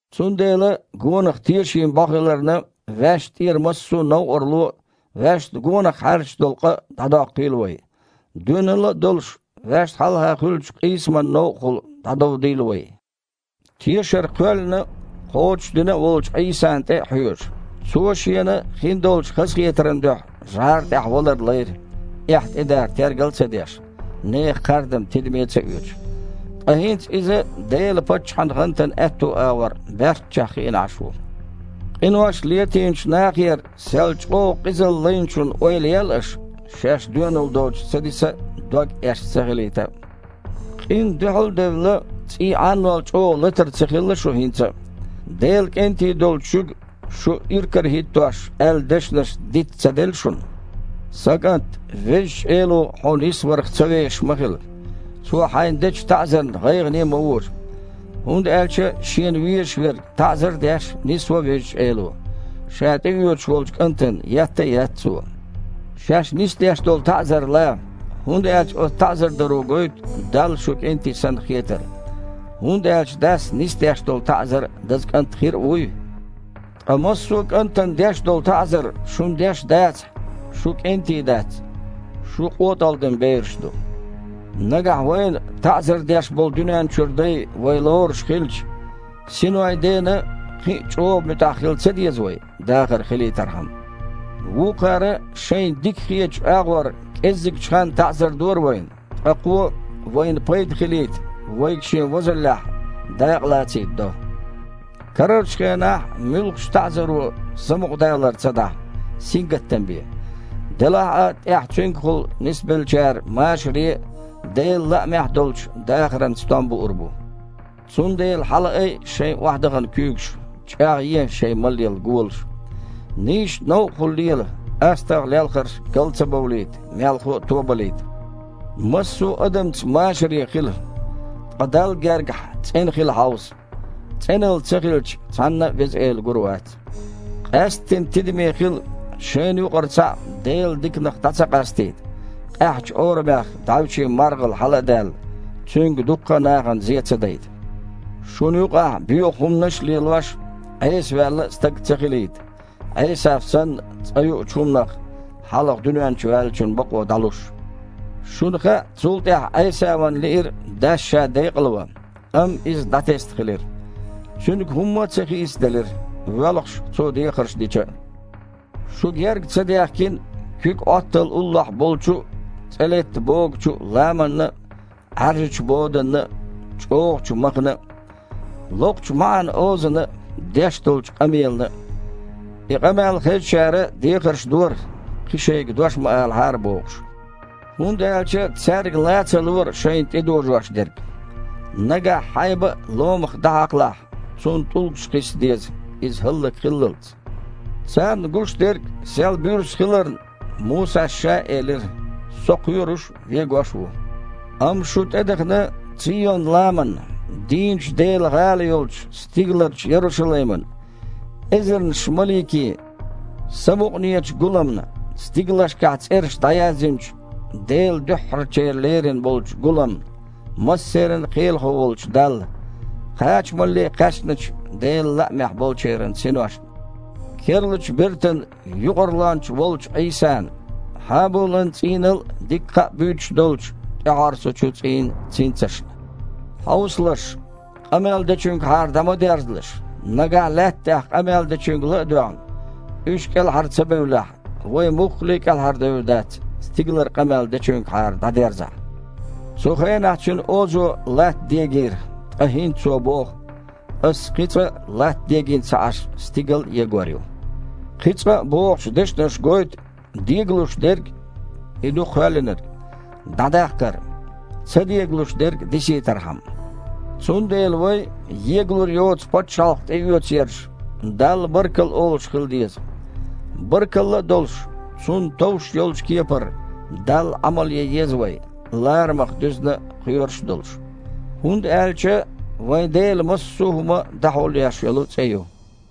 Цундела, гонах тешийн бІо хиларна, ваьшна тІера массо а новкъарло а, ваьшна гонах хьаьрчаш долу къа а дІадоккхийла вай. Доьналла а долуш, ваьшна хьалха хуьлучу къийсаман новкъахула дІадовдийла вай, тешар кхоьллина а, кхочушдина а волчу Іийсана тІе а хьоьжуш. Цо Шена хин долчу хазахетаран дуьхьа жІара тІехь валар лайра, эхь тІе дар тергал а ца деш, нехан кхардам тидаме а ца оьцуш. Ткъа хІинца Иза Делан паччахьан гІантана аьтту агІор, баьрччехь, хиъна Іаш ву. Къинош летийначу нахера сел чІогІа къизалла Лайначун ойла ел аш, шаьш доьналла доцуш ца диса а, дог эшна ца хилийта а. Къинна дуьхьал а девлла, цІий Іаннол чІогІа латар ца хилла шун хІинца а. Делан кІентий долчу шуьга, шу иракарахІиттош, аьлла дешнаш диц-м ца делла шуна? «Сан кІант, Везачу Эло хьо нисварх ца вешаш ма хила, Цо хьайна дечу таІзарна гІайгІане а ма вожа. ХІунда аьлча Шена везаш верг, таІзар а деш, нисво Везачу Эло. Ша тІеоьцуш волчу кІантана етта а етта Цо». Шаьш нисдеш долу таІзар ла, хІунда аьлча оцу таІзар даро гойту, Далла шу кІентий санна хетар. ХІунда аьлча дас нисдеш долу таІзар даза кІант хир а вуй? Ткъа массо а кІантана деш долу таІзар шуна деш дацахь, шу кІентий дац, шу къотІалгІадина бераш ду. Нагахь вайна таІзар деш болу дуьнен чуьра дай вай лоруш хилча, синойн Дена кхин а чІогІа муьтІахь хила ца деза вай, дахар хилийтархьама? Вукхара шайна дика хетачу агІор кІезигчу ханна таІзар дора вайна, ткъа Кхо – вайна пайда хилийта, вайга Шен возаллехь дакъа лацийта до. Карарчу хенахь муьлххачу а таІзаро самукъадалар ца дахьа, сингаттам бен. Делахь а тІаьхьа цуьнгахула нисбеллачара машаре а, Делан лаамехь а долчу дахаран стом буур бу. Цундела хьалаайа шайн охьадахана куьйгаш, чІагІъе шайн малъелла голаш. Нийсачу новкъахула лела, астагІа лелхарш гал ца бовлийта, мелхо а тобалийта. Массо а адамца машаре хила, ткъа Далла гергахь цІена хила хьовса. ЦІеналла ца хилча, цхьанна а Веза Эла гур вац. Къаьсттина тидаме хила шайна юкъара цхьаъ Делан диканах дІа ца къастийта, «къаьхьачу орамех дІаьвше маргІал хьала а даьлла, цуьнга дуккха а нахана зен ца дайта». Шуна юкъахь, боьха хІуманаш лелош а, Іесаваьлла а стаг ца хилийта, Іесав санна, цкъа юучу хІуманах хьалха дуьнен чу ваьллачун бакъо дІалуш. Шуна хаьа, цул тІаьхьа Іесавана лиира дас ша декъалван, амма иза дІатесна хилира. Цуьнга хІумма а ца хийцаделира, воьлхуш, цо дехарш дича а. Шу герга ца даьхкина куьг Іоттал уллохь болчу а, цІе летта богучу а ламанна а, Іаьржачу боданна а, чІогІачу махана а, локхучу маІан озана а, деш долчу къамелана а. И къамел хезачара дехарш дора, кхин шайга дош ма алахьара бохуш. ХІунда аьлча цаьрга лан ца лора шайна тІедожош дерг: «Нагахь хьайба а ломах дІахьакхалахь, цунна тІулгаш кхисса деза, иза хІаллакьхиллалц». Царна гуш дерг сел буьрса хиларна, Мусас ша а элира: «Со кхоьруш а, вегош а ву». Амма шу тІедахана Цийон-ламанна, дийначу Делан гІала йолчу стигаларчу Ярушалаймана, эзарнаш маликийн самукъанечу гуламна, стигалшкахь цІераш дІаязйинчу Делан дуьххьарчеран леррина болчу гуламна, массеран Кхелахо волчу Далла, кхачамалле кхаьчначу Делан лаамехь болчеран синошна, керлачу бертан Юкъарлонча волчу Іийсана, Хьабулан цІийнал а дика кхаъ буьйцуш долчу, тІехьорсучу цІийн цинцашна. Хьовсалаш, къамел Дечуьнгахьара дІа ма дерзалаш. Нагахь, Лаьтта тІехь къамел дечуьнга ла а доьгІна, уьш а кІелхьара ца бевллехь, вай муххале а кІелхьардевр дац, стигалара къамел Дечуьнгахьара дІадерзахь. Цу хенахь Цуьнан озо Латта дегийра, ткъа хІинца Цо боху: «Ас кхин цкъа а, Латта дегийна ца Іаш, стигал а егор ю». «Кхин цкъа а» бохучу дешнаша гойту дегалуш дерг (и ду кхоьллинарг) дІадаккхар, ца дегалуш дерг дисийтархьама. Цундела вай, егалур йоцу пачхьалкх тІеоьцу ерш, Далла баркалла олуш хила деза. Баркалла а долуш, Цунна товш йолчу кепара Далла Іамал ян еза вай, ларамах дуьзна а, кхоьруш а долуш, хІунда аьлча «вайн Дела массо а хІума дІахьулъеш йолу цІе ю».